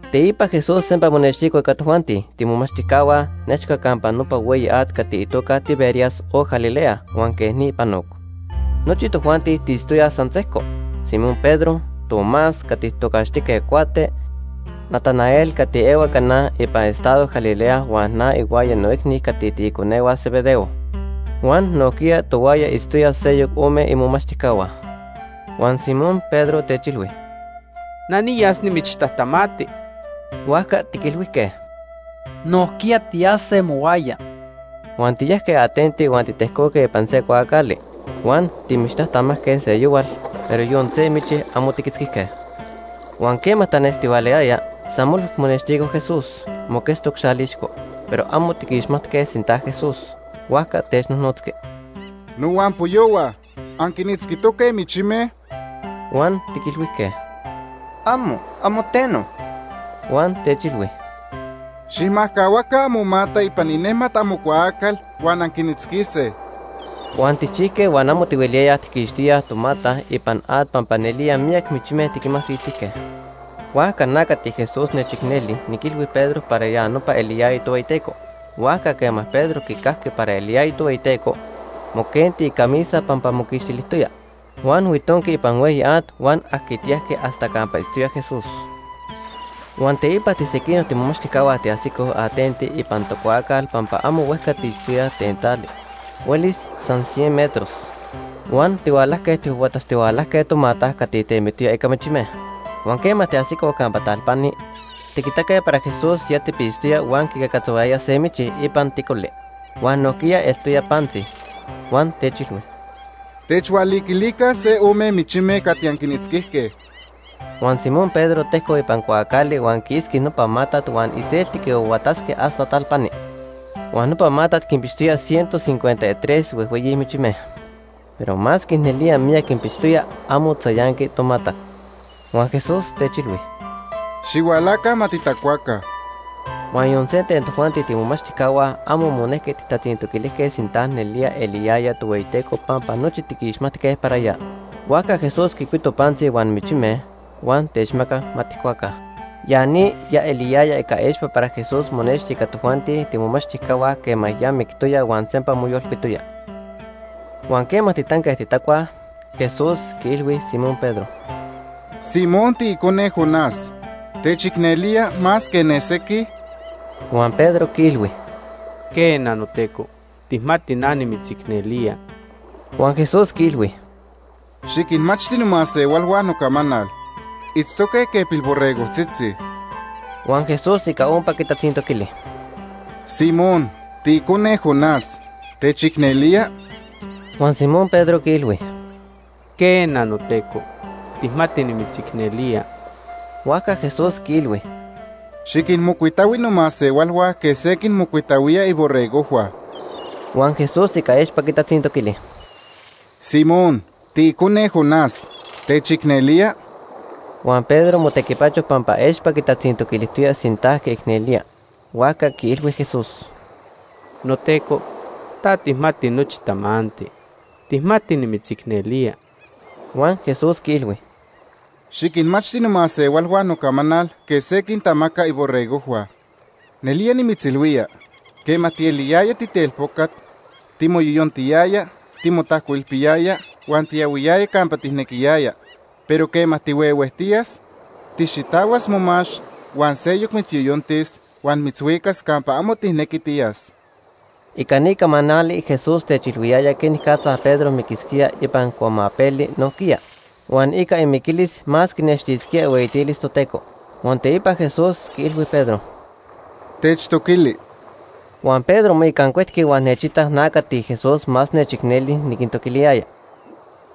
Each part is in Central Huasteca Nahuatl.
Teipa Jesús sempa monextico ica tojuanti tiimomachtijcahua nechca campa nopa hueyi at cati itoca Tiberias o Galilea huan quej ni panoc. Nochi tojuanti tiitztoyaj san sejco: Simón Pedro, Tomás cati tijtocaxtijque Cuate, Natanael cati ehua Caná ipan estado Galilea huan na ihuaya noicni cati tiiconehua Zebedeo. Huan nojquiya tohuaya itztoyaj seyoc ome imomachtijcahua. Huan Simón Pedro techilhui: ―Na niyas nimichtajtamati. Huajca tiquilhuijque: ―Nojquiya tiyase mohuaya. Huan tiyajque atenti huan titejcoque ipan se cuaacali. Huan timichtajtamajque seyohual, pero yon se michi amo tiquitzquijque. Huan quema tanestihualayaya, san molhui monextico Jesús, moquetztoc xalixco, pero amo tiquixmatque sinta Jesús. Huajca technojnotzqui: ―Nohuampoyohua, ¿anquinitzquitoque michime? Huan tiquilhuijque: ―Amo, amo teno. Huan techilhui: ―Xijmajcahuaca amomata ipan inejmat amocuaacal huan anquinitzquise. Huan tijchijque huan amo tihueliyayaj tijquixtíaj tomata ipan at pampa nelía miyac michime tiquinmasiltijque. Huajca na cati Jesús nechicneli niquilhui Pedro para ya nopa eliyaya Tohueyiteco. Huajca quema Pedro quicajqui para eliyaya Tohueyiteco, moquenti icamisa pampa moquixtilijtoya, huan huitonqui ipan hueyi at huan ajquitiyajqui hasta campa itztoya Jesús. Huan teipa tisequinoc imomachtijcahua tiajsicoj atenti ipan tocuaacal pampa amo huejca tiitztoyaj ten tali, huelis san cien metros. Huan tihualajque tijhuahuatatztihualajque tomata cati temitoya ica michime. Huan quema tiajsicoj campa talpani, tiquitaque para Jesús ya tipitztoya huan quicacatzohuayaya se michi ipan ticoli. Huan nojquiya eltoya pantzi. Huan techilhui: ―Techhualiquilica se ome michime cati anquinitzquijque. Huan Simón Pedro tejcoc ipan cuaacali huan quiitzqui nopa matat huan iselti quihuahuatatzqui hasta talpani. Huan nopa matat quinpixtoya ciento cincuenta y tres huejhueyi michime. Pero masque nelía miyac quinpixtoya, amo tzayanqui tomata. Huan Jesús techilhui: ―Xihualaca, ma titacuaca. Huan yon se ten tojuanti tiimomachtijcahua amo monejqui tijtatzintoquilijque sinta nelía eliyaya Tohueyiteco pampa nochi tiquixmatque para ya. Huajca Jesús quicuito pantzi huan michime, huan techmacac ma tijcuaca. Ya ni ya eliyaya ica expa para Jesús monexti ica tojuanti tiimomachtijcahua quema ya mictoya huan sempa moyolcuitoya. Huan quema titanque titacuaj, Jesús quiilhui Simón Pedro: ―Simón, tiicone Jonás, ¿techicnelía más que ne sequij? Huan Pedro quiilhui: ―Quena, noTeco, tijmati na nimitzicnelía. Huan Jesús quiilhui: ―Xiquinmachti nomasehualhua nocamanal. Itztoque quej pilborregojtzitzi. Huan Jesús ica ompa quitatzintoquili: ―Simón, tiicone Jonás, ¿techicnelía? Huan Simón Pedro quiilhui: ―Quena, noTeco, tijmati nimitzicnelía. Huajca Jesús quiilhui: ―Xiquinmocuitahui nomasehualhua quej se quinmocuitahuía iborregojhua. Huan Jesús ica expa quitatzintoquili: ―Simón, tiicone Jonás, ¿techicnelía? Huan Pedro motequipacho pampa expa quitatzintoquilijtoya sinta quiicnelía, huajca quiilhui Jesús: ―NoTeco, ta tijmati nochi tamanti. Tijmati nimitzicnelía. Huan Jesús quiilhui: ―Xiquinmachti nomasehualhua nocamanal quej se quintamaca iborregojhua. Nelía nimitzilhuía, quema tieliyaya titelpocat, timoyoyontiyaya, timotajcoilpiyaya huan tiyahuiyaya campa tijnequiyaya, pero quema tihuehuejtiyas, tijxitahuas momax huan seyoc mitzyoyontis huan mitzhuicas campa amo tijnequi tiyas. Ica ni camanali, Jesús techilhuiyaya quenicatza Pedro miquisquía ipan cuamapeli nojquiya, huan ica imiquilis más quinextisquía ihueyitilis Toteco. Huan teipa Jesús quiilhui Pedro: ―¡Techtoquili! Huan Pedro moicancuetqui huan nechitac na cati Jesús más nechicneli niquintoquiliyaya.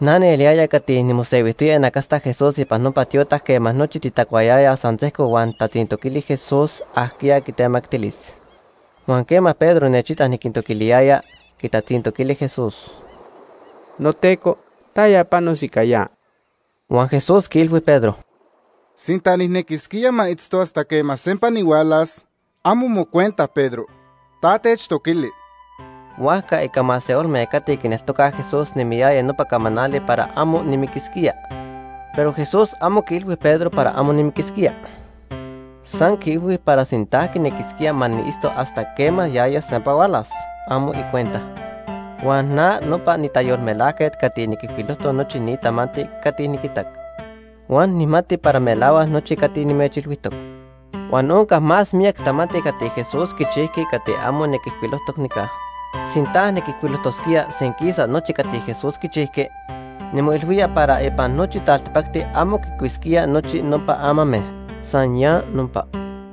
Na nieliyaya cati nimosehuijtoya inacasta Jesús ipan nopa tiotac quema nochi titacuayayaj san sejco huan nijtatzintoquili Jesús ajquiya quitemactilis. Huan quema Pedro nechitac niquintoquiliyaya, quitatzintoquili Jesús: ―NoTeco, ¿taya panos ica ya? Huan Jesús quiilhui Pedro: ―Sinta nijnequisquía ma itztos hasta quema sempa nihualas, amo mocuenta Pedro. Ta techtoquili. Huajca ica masehualme cati quineltocaj Jesús nemiyaya nopa camanali para amo nimiquisquía. Pero Jesús amo quiilhui Pedro para amo nimiquisquía. San quiilhui para sinta quinequisquía ma niitztos hasta quema yaya sempa hualas, amo icuenta. Huan na nopa nitayolmelajquet cati niquijcuilojtoc nochi ni tamanti cati niquitac. Huan nijmati para melahuac nochi cati nimechilhuijtoc. Huan onca más miyac tamanti cati Jesús quichijqui cati amo niquijcuilojtoc nica. Sinta niquijcuilojtosquía senquisa nochi cati Jesús quichijqui, nimoilhuía para ipan nochi taltipacti amo quicuisquía nochi nopa amame. San ya nopa.